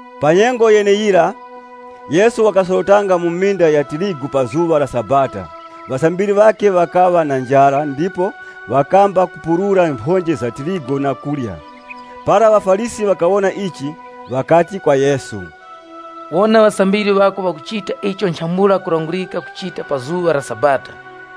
Pa nyengo yeneyira, Yesu wakasorotanga mu minda ya tirigu pa zuŵa la Sabata Ŵasambiri ŵakhe ŵakaŵa na njara ndipo ŵakamba kupurura mphonje za tirigu na kurya. Para ŵaFarisi ŵakawona ichi, ŵakati kwa Yesu, “Wona ŵasambiri ŵako ŵakuchita icho nchambula kulangurika kuchita pa zuŵa la Sabata.”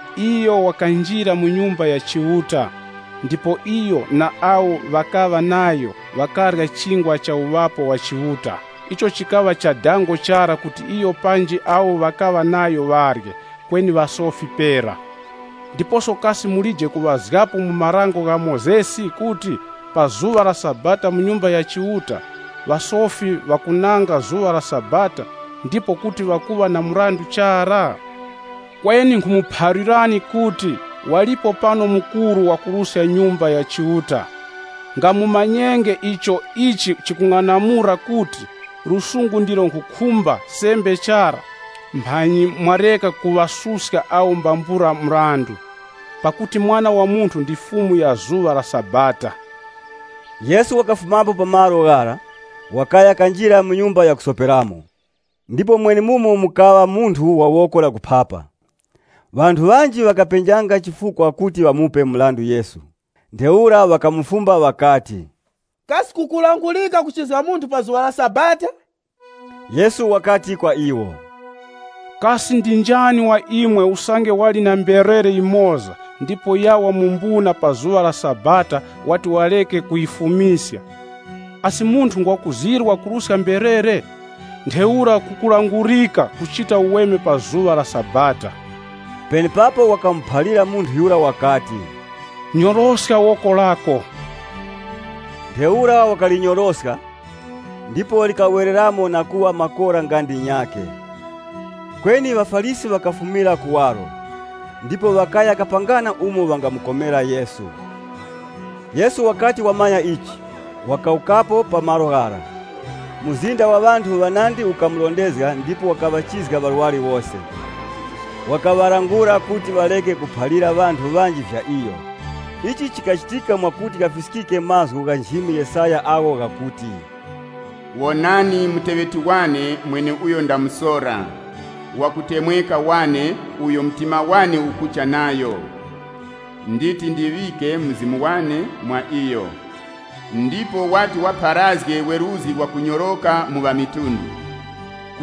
Iyo wakanjira mu Nyumba ya Chiuta, ndipo ŵakarya Chingwa cha Uŵapo wa Chiuta, icho chikaŵa cha dango chara kuti iyo panji awo ŵakaŵa nayo ŵarye, kweni ŵasofi pera. Ndiposo kasi mulije kuŵazgapo mu Dango la Mozesi kuti, pa zuŵa la Sabata mu Nyumba ya Chiuta, ŵasofi ŵakunanga zuŵa la Sabata, ndipo kuti ŵakuŵa na mrandu chara? Kweni nkhumuphalirani kuti, walipo pano mukuru wakuruska Nyumba ya Chiuta. Nga mumanyenge icho ichi chikung'anamula kuti, ‘Chisungusungu ndicho nkhukhumba sembe chara.’ Mphanyi mwareka kuŵasuska awo mbambula mrandu. Pakuti Mwana wa Munthu ndi Fumu ya zuŵa la Sabata.” Yesu wakafumapo pa malo ghara, wakaya kanjira mu nyumba ya kusoperamo. Ndipo mwenemumo mukaŵa munthu wa woko la kuphapa. Ŵanthu ŵanji ŵakapenjanga chifukwa kuti ŵamupe mrandu Yesu, ntheura ŵakamufumba ŵakati, “Kasi kukulangurika kuchizga munthu pa zuŵa la Sabata?” Yesu wakati kwa iwo, “Kasi ndi njani wa imwe usange wali na mberere yimoza ndipo yawa mu mbuna pa zuŵa la Sabata wati warekenge kuyifumiska? Asi munthu ngwa kuzirwa kuruska mberere? Ntheura kukulangurika kuchita uweme pa zuŵa la Sabata.” Penepapo wakamuphalira munthu yura wakati, “Nyoroska woko lako.” Ntheura wakalinyoroska, ndipo likawereramo na kuŵa makora nga ndinyakhe. Kweni ŵaFarisi ŵakafumira kuwaro, ndipo ŵakaya kapangana umo ŵangamukomera Yesu. Yesu wakati wamanya ichi, wakawukapo pa malo ghara. Mzinda wa ŵanthu ŵanandi ukamurondezga ndipo wakaŵachizga ŵarwari wose. Wakaŵalangula kuti ŵareke kuphalira ŵanthu ŵanji vya iyo. Ichi chikachitika mwakuti ghafiskike mazgu gha nchimi Yesaya agho ghakuti, “Wonani muteŵeti wane mweneuyo ndamusora, wakutemweka wane, uyo mtima wane ukucha nayo! Nditi ndiŵike Mzimu wane mwa iyo, ndipo wati wapharazge weruzgi, wakunyoroka ku mafuko ghose. (LXX)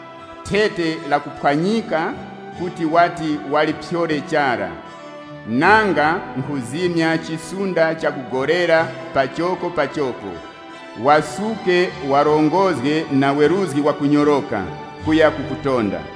Thete lakuphwanyika kuti wati waliphyore chara, nanga nkhuzimya chisunda chakugolera pachokopachoko, wasuke wachite kuti weruzgi wakunyoroka utonde.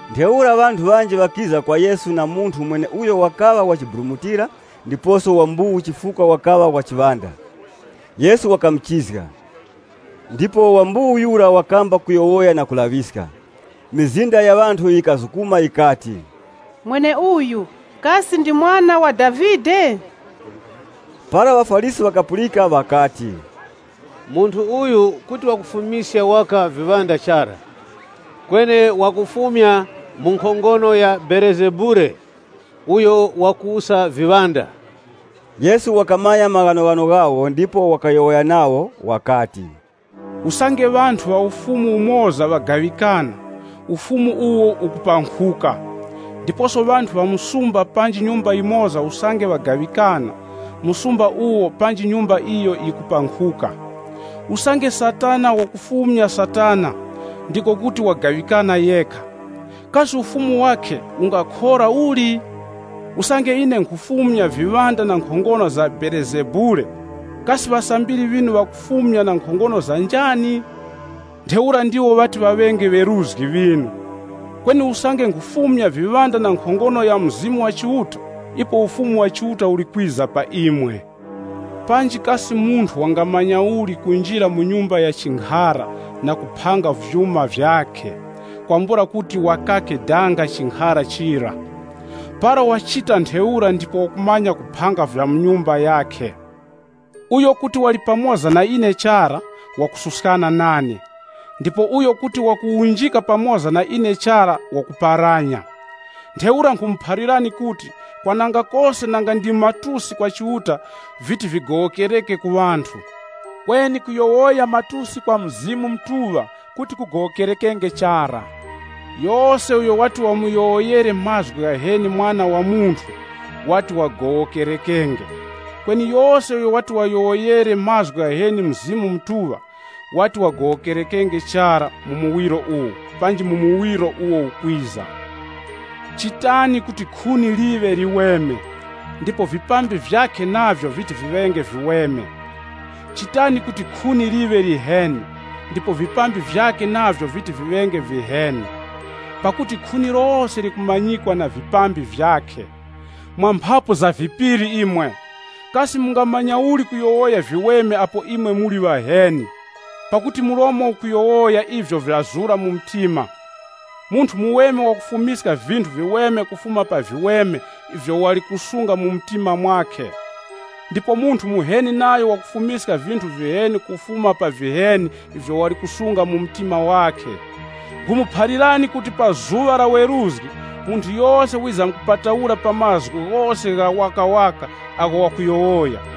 Ntheura ŵanthu ŵanji ŵakiza kwa Yesu na munthu mweneuyo wakaŵa wachiburumutira ndiposo wa mbuwu chifukwa wakaŵa na chiŵanda. Yesu wakamuchizga, ndipo wa mbuwu yura wakamba kuyowoya na kulaŵiska. Mizinda ya ŵanthu yikazukuma yikati, “Mweneuyu, kasi ndi Mwana wa Davide?” Para ŵaFarisi ŵakapulika ŵakati, “Munthu uyu kuti wakufumiska waka viŵanda chara, kweni wakufumya mu nkhongono ya Belezebule, uyo wakuwusa viŵanda.” Yesu wakamanya maghanoghano ghawo ndipo wakayowoya nawo wakati, Usange ŵanthu ŵa ufumu umoza ŵagaŵikana ufumu uwo ukupankhuka. Ndiposo ŵanthu ŵa msumba panji nyumba yimoza usange ŵagaŵikana, msumba uwo panji nyumba iyo yikupankhuka. Usange Satana wakufumya Satana, ndiko kuti wagaŵikana yekha. Kasi ufumu wakhe ungakhora uli? Usange ine nkhufumya viŵanda na nkhongono za Belezebule, kasi ŵasambiri ŵinu ŵakufumya na nkhongono za njani? Ntheura ndiwo ŵati ŵaŵenge ŵeruzgi ŵinu. Kweni usange nkhufumya viŵanda na nkhongono ya Mzimu wa Chiuta, ipo Ufumu wa Chiuta uli kwiza pa imwe. “Panji kasi munthu wangamanya uli kunjira mu nyumba ya chinkhara na kuphanga vyuma vyakhe, kwambula kuti wakake danga chinkhara chira? Para wachita ntheura ndipo wakumanya kuphanga vya mu nyumba yakhe. “Uyo kuti wali pamoza na ine chara, wakususkana nane. Ndipo uyo kuti wakuwunjika pamoza na ine chara wakuparanya. Ntheura nkhumuphalirani kuti, kwananga kose nanga ndi matusi kwa Chiuta viti vigowokereke ku ŵanthu, kweni kuyowoya matusi kwa Mzimu Mutuŵa kuti kugowokerekenge chara. Yose uyo wati wamuyowoyere mazgu ghaheni Mwana wa Munthu, wati wagowokerekenge, kweni yose uyo wati wayowoyere mazgu ghaheni Mzimu Mutuŵa, wati wagowokerekenge chara mu muwiro uwu, panji mu muwiro uwo ukwiza. “Chitani kuti khuni liŵe liweme, ndipo vipambi vyakhe navyo viti viŵenge viweme. Chitani kuti khuni liŵe liheni, ndipo vipambi vyakhe navyo viti viŵenge viheni. Pakuti khuni lose likumanyikwa na vipambi vyakhe. Mwa mphapu za vipiri imwe, kasi mungamanya uli kuyowoya viweme apo imwe muli ŵaheni? Pakuti mlomo ukuyowoya ivyo vyazura mu mtima. Munthu muweme wakufumiska vinthu viweme kufuma pa viweme ivyo wali kusunga mu mtima mwakhe. Ndipo munthu muheni nayo wakufumiska vinthu viheni kufuma pa viheni ivyo wali kusunga mu mtima wakhe. “Nkhumuphalirani kuti pa zuŵa la weruzgi, munthu yose wizamkupataura pa mazgu ghose ghawakawaka agho wakuyowoya.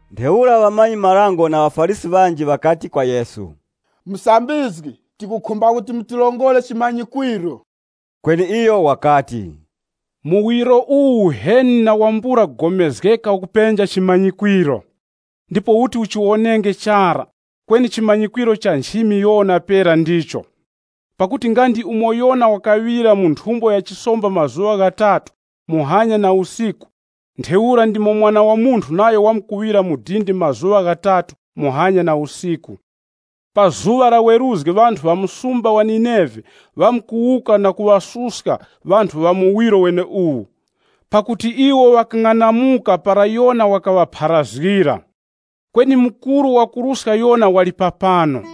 Ntheura ŵamanyi-marango ŵanji na ŵaFarisi ŵanji ŵakati kwa Yesu, “Musambizgi, tikukhumba kuti mutirongore chimanyikwiro.” Kweni iyo wakati, Muwiro uwu uheni na wambula kugomezgeka ukupenja chimanyikwiro! Ndipo uti uchiwonenge chara, kweni chimanyikwiro cha nchimi Yona pera ndicho. Pakuti nga ndi umo Yona wakaŵira mu nthumbo ya chisomba mazuŵa ghatatu, muhanya na usiku, ntheura ndimo Mwana wa Munthu nayo wamkuŵira mu dindi mazuŵa ghatatu muhanya na usiku. Pa zuŵa la weruzgi ŵanthu ŵa msumba wa Nineve ŵamkuwuka na kuŵasuska ŵanthu ŵa muwiro weneuwu, pakuti iwo ŵakang'anamuka para Yona wakaŵapharazgira. Kweni mukuru wakuruska Yona wali papano.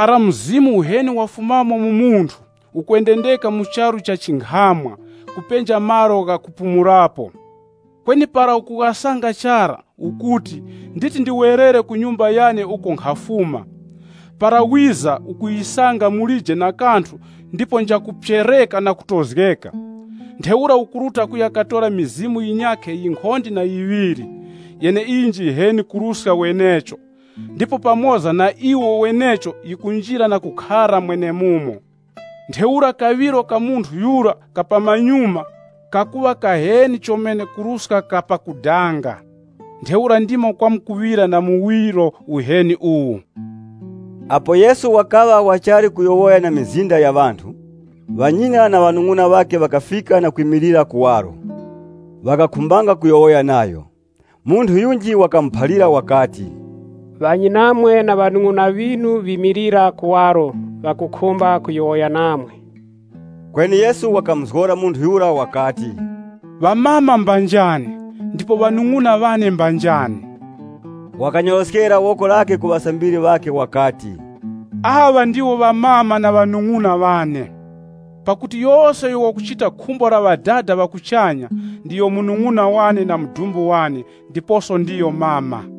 “Para mzimu uheni wafumamo mu munthu, ukwendendeka mu charu cha chinkhamwa, kupenja malo ghakupumulapo. Kweni para ukughasanga chara, ukuti, ‘Nditi ndiwerere ku nyumba yane uko nkhafuma.’ Para wiza ukuyisanga mulije na kanthu ndipo njakuphyereka na kutozgeka. Ntheura ukuruta kuya katora mizimu yinyakhe yinkhonde na yiŵiri, yeneiyo njiheni kuruska wenecho, ndipo pamoza na iwo wenecho yikunjira na kukhara mwenemumo. Ntheura kaŵiro ka munthu yura ka pamanyuma, kakuŵa kaheni chomene kuruska kapakudanga. Ntheura ndimo kwamkuŵira na muwiro uheni uwu.” Apo Yesu wakaŵa wachali kuyowoya na mizinda ya ŵanthu, ŵanyina na ŵanung'una ŵakhe ŵakafika na kwimilira kuwaro. Ŵakakhumbanga kuyowoya nayo. [ Munthu yunji wakamuphalira Yesu wakati, “Ŵanyinamwe na ŵanung'una ŵinu ŵimilira kuwaro ŵakukhumba kuyowoya namwe.”] Kweni Yesu wakamuzgora munthu yura wakati, “Amama mba njani, ndipo ŵanung'una ŵane mba njani?” Wakanyoroskera woko lakhe ku ŵasambiri ŵakhe wakati, “Aŵa ndiwo amama na ŵanung'una ŵane! Pakuti yose uyo wakuchita khumbo la Ŵadada ŵa kuchanya, ndiyo munung'una wane na mudumbu wane ndiposo ndiyo mama.”